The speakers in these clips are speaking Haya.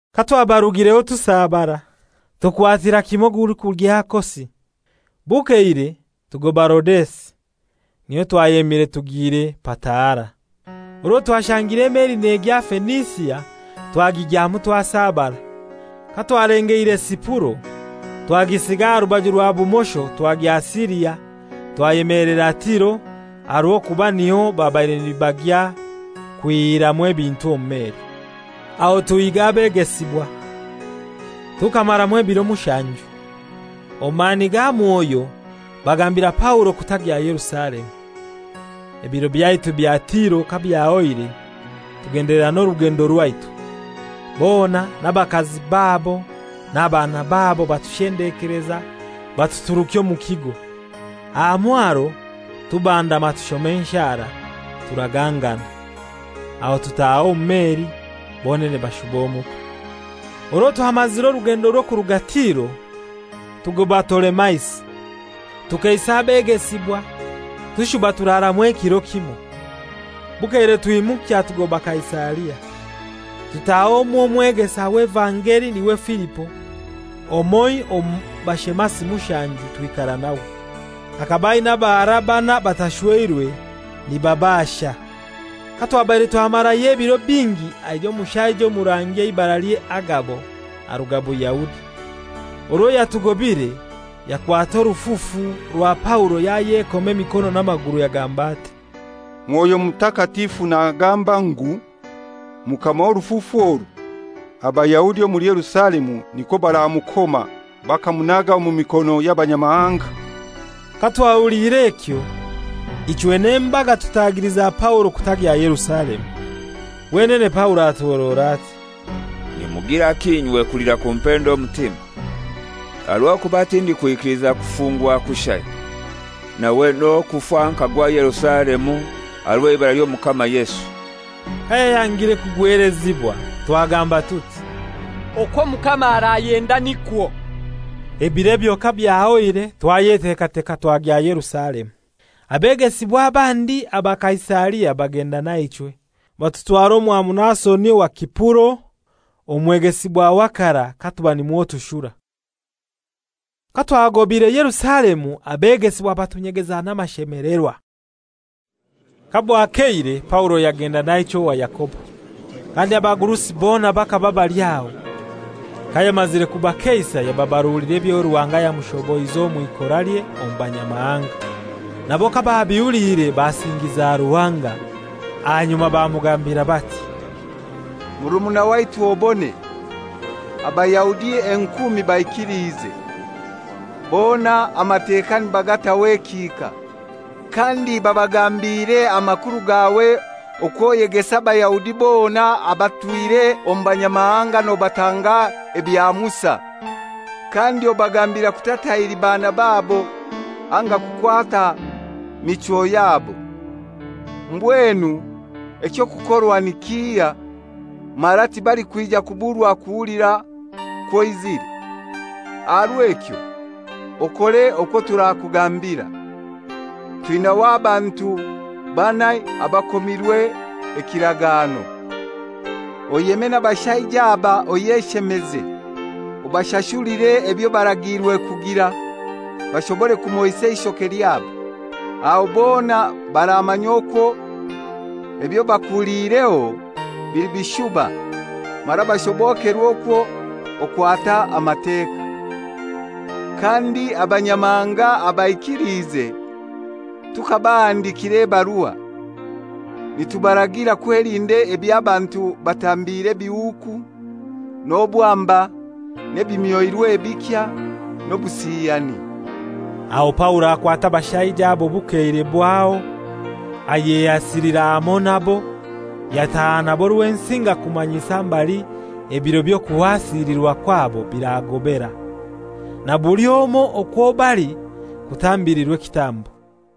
Katwabarugireho tusabara, tukwatira kimoi ogulikugya Kosi, bukeire tugoba Rodesi, niho twayemire tugiire Pataara. Orwo twashangire emeli negya Fenisia, twagigyamu twasabara. Katwalengeire Sipuro, twagisiga aha rubaju rwa bumosho twagya Siria, twayemelera Tiro, aha rw'okuba niho babaire nibagya kwihiramu ebintu omu meli. Aho tuhiiga abegesibwa, tukamaramu ebiro mushanju. Omu mani ga Mwoyo bagambira Paulo kutagya Yerusalemu. Ebiro byaitu bya Tiro kabyahoire, tugendelera n'orugendo rwaitu. Bona, n'abakazi babo n'abaana babo, batushendekeleza batuturukya omu kigo. Aha mwaro tubandama tushoma enshara, turagangana. Aho tutaaha omu meli, bonene bashuba omuka. Orwo twamazire orugendo rw'okuruga Tiro, tugoba Tolemaisi, tukeisa abegesibwa tushuba turaramu ekiro kimoi. Bukeire twimukya tugoba Kaisaria. Tutaha omw'omwegesa w'evangeli, n'iwe Filipo, omoi omu bashemasi mushanju, twikara nawe. Akaba aina abahara banai batashweirwe, nibashasha. Katwabaire twamarayo ebiro bingi aija omushaija omurangi eibaralye Agabo, aruga Buyahudi. Orwo yatugobire yakwata orufufu rwa Paulo yayekoma emikono n'amaguru yagamba ati, «Mwoyo Mutakatifu nagamba ngu: Mukama w'orufufu oru, Abayahudi omuli Yerusalemu nikwo baramukoma bakamunaga omu mikono y'Abanyamahanga.» Katwahuliire ekyo, ichwe n'embaga tutagiliza Paulo kutagya Yerusalemu. Wenene Paulo atuhorora ati, «Nimugiraki inywe kulira kumpenda omutima? Aha rw'okuba tindikwikiliza kufungwa kushai, nawe n'okufa nkagwa Yerusalemu aha rw'eibara ly'Omukama Yesu.» Kayayangire kugwelezibwa twagamba tuti, «Okwo Omukama arayenda nikwo.» Ebiro ebyo kabyahoire twayetekateka twagya Yerusalemu. Abegesibwa abandi aba Kaisaria bagenda naichwe, batutwara omwa Muasoni owa Sipuro omwegesibwa wa karai katuba nimwo tushura. Katwagobaire Yerusalemu abegesibwa batunyegeza n'amashemelerwa. Kabwakeire Paulo yagenda naichwe owa Yakobo; kandi abagurusi bona bakaba bali aho. Kayamazire kubakeisa yababarulira ebyo Ruhanga yamushoboize omw'ikoralye omu banyamahanga. Nabo kababihuliire basingiza Ruhanga. Ahanyuma bamugambira bati, «Murumuna waitu obone, Abayahudi enkumi baikiliize; bona Amateka nibagataho ekihika. Kandi babagambiire amakuru gaawe okwo oyegesa Abayahudi bona abatwire omu Banyamahanga nobatanga ebya Musa, kandi obagambira kutatahiri baana babo anga kukwata michwo yabo. Mbwenu eky'okukorwa ni kihai? Mara tibalikwija kuburwa kuhulira kwo oizire. Aha rw'ekyo okore okwo turakugambira. Twinaho abantu banai abakomirwe ekiragano. Oyeme n'abashaija aba oyeshemeze, obashashulire ebyo baragiirwe kugira, bashobore kumoisa eishoke lyabo. Aho bona baramanya okwo ebyo bakuhuliireho bili bishuba mara bashobokerwe okwo okwata Amateka. Kandi Abanyamahanga abaikiliize tukabahandikira ebarua, nitubaragira kwelinda eby'abantu batambiire ebihuuku, n'obwamba n'ebimyoirwe ebikya, n'obusiyani.» Aho Paulo akwata abashaija abo bukeire bwaho, ayehasilira hamoi nabo, yataha nabo Rwensinga kumanyisa mbali ebiro by'okuhasilirwa kwabo biragobaera, na buli omoi okwo bali kutambilirwa ekitambo.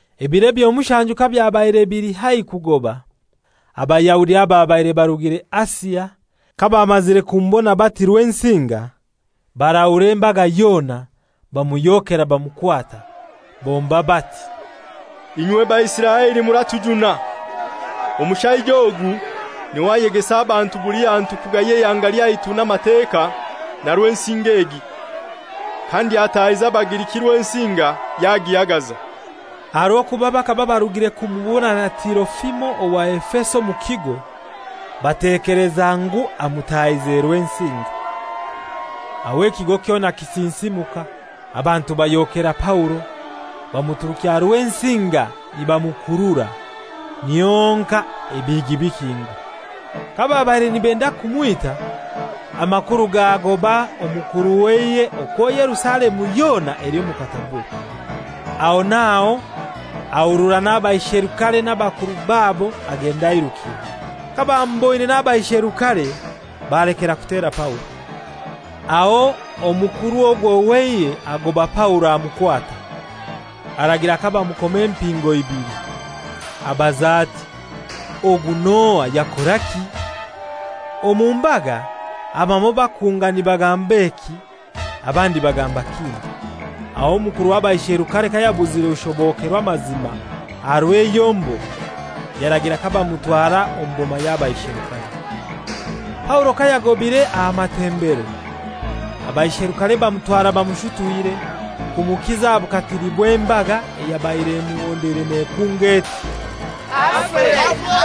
Ebiro ebyo mushanju kabyabaire bili haihi kugoba, Abayahudi ababaire barugire Asia, kabamazire kumubona bati Rwensinga barahura embaga yona, bamuhyokera bamukwata. Bomba bati, «Inywe Baisiraeli muratujuna! Omushaija ogu n'iwe ayegesa abantu buli hantu kugaya eihanga lyaitu n'Amateka na Rwensinga egi. Kandi atahize Abagiriki Rwensinga yagihagaza.» Aha rw'okuba bakaba barugire kumubona na Tirofimo owa Efeso omu kigo, batekeleza ngu amutahize Rwensinga. Aho ekigo kyona kisinsimuka, abantu bahyokera Paulo, bamuturukya Rwensinga nibamukurura, niho honkai ebihigi bikingwa. Kababaire nibenda kumwita, amakuru gaagobaa omukuru w'eihe okwo Yerusalemu yona eli omu katabure. Aho n'aho ahurura n'abaisherukare n'abakuru babo agenda airukire. Kabamuboine n'abaisherukare balekera kutera Paulo. Aho omukuru ogwo w'eihe agoba Paulo amukwata, aragira kabamukoma empingo ibili. Abaza ati, «Ogu n'ohai, yakoraki?» Omu mbaga abamoi bakunga nibagamba eki, abandi bagamba kindi. Aho omukuru w'abaisherukare kayabuzire kushobokerwa amazima aha rw'eyombo, yaragira kabamutwara omu boma y'abaisherukare. Paulo kayagobaire aha matembero, abaisherukare bamutwara bamushutwire kumukiza aha bukatili bw'embaga, eyabaire emuhondeire nekunga eti, «Afe!»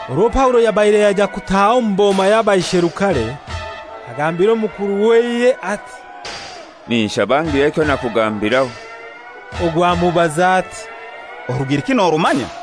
Orwo Paulo yabaire yaija kutaaha omu boma y'abaisherukare, agambira omukuru w'eihe ati, «Ninshaba ngire ekyo nakugambiraho!» Ogu amubaza ati, «Orugiriki norumanya?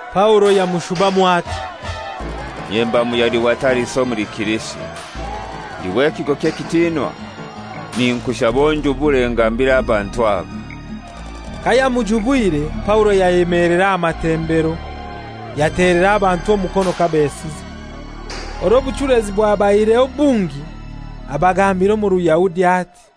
Paulo yamushubamu ati, «Inye mba Muyahudi wa Tariso omuli Silisia, ndi w'ekigo ky'ekitinwa. Ninkushaba onjubure ngambire abantu aba.» Kayamujubwire, Paulo yayemelera aha matembero, yatelera abantu omukono kabesiza. Orwo obuchulezi bwabaireho bungi, abagambira omu Ruyahudi ati: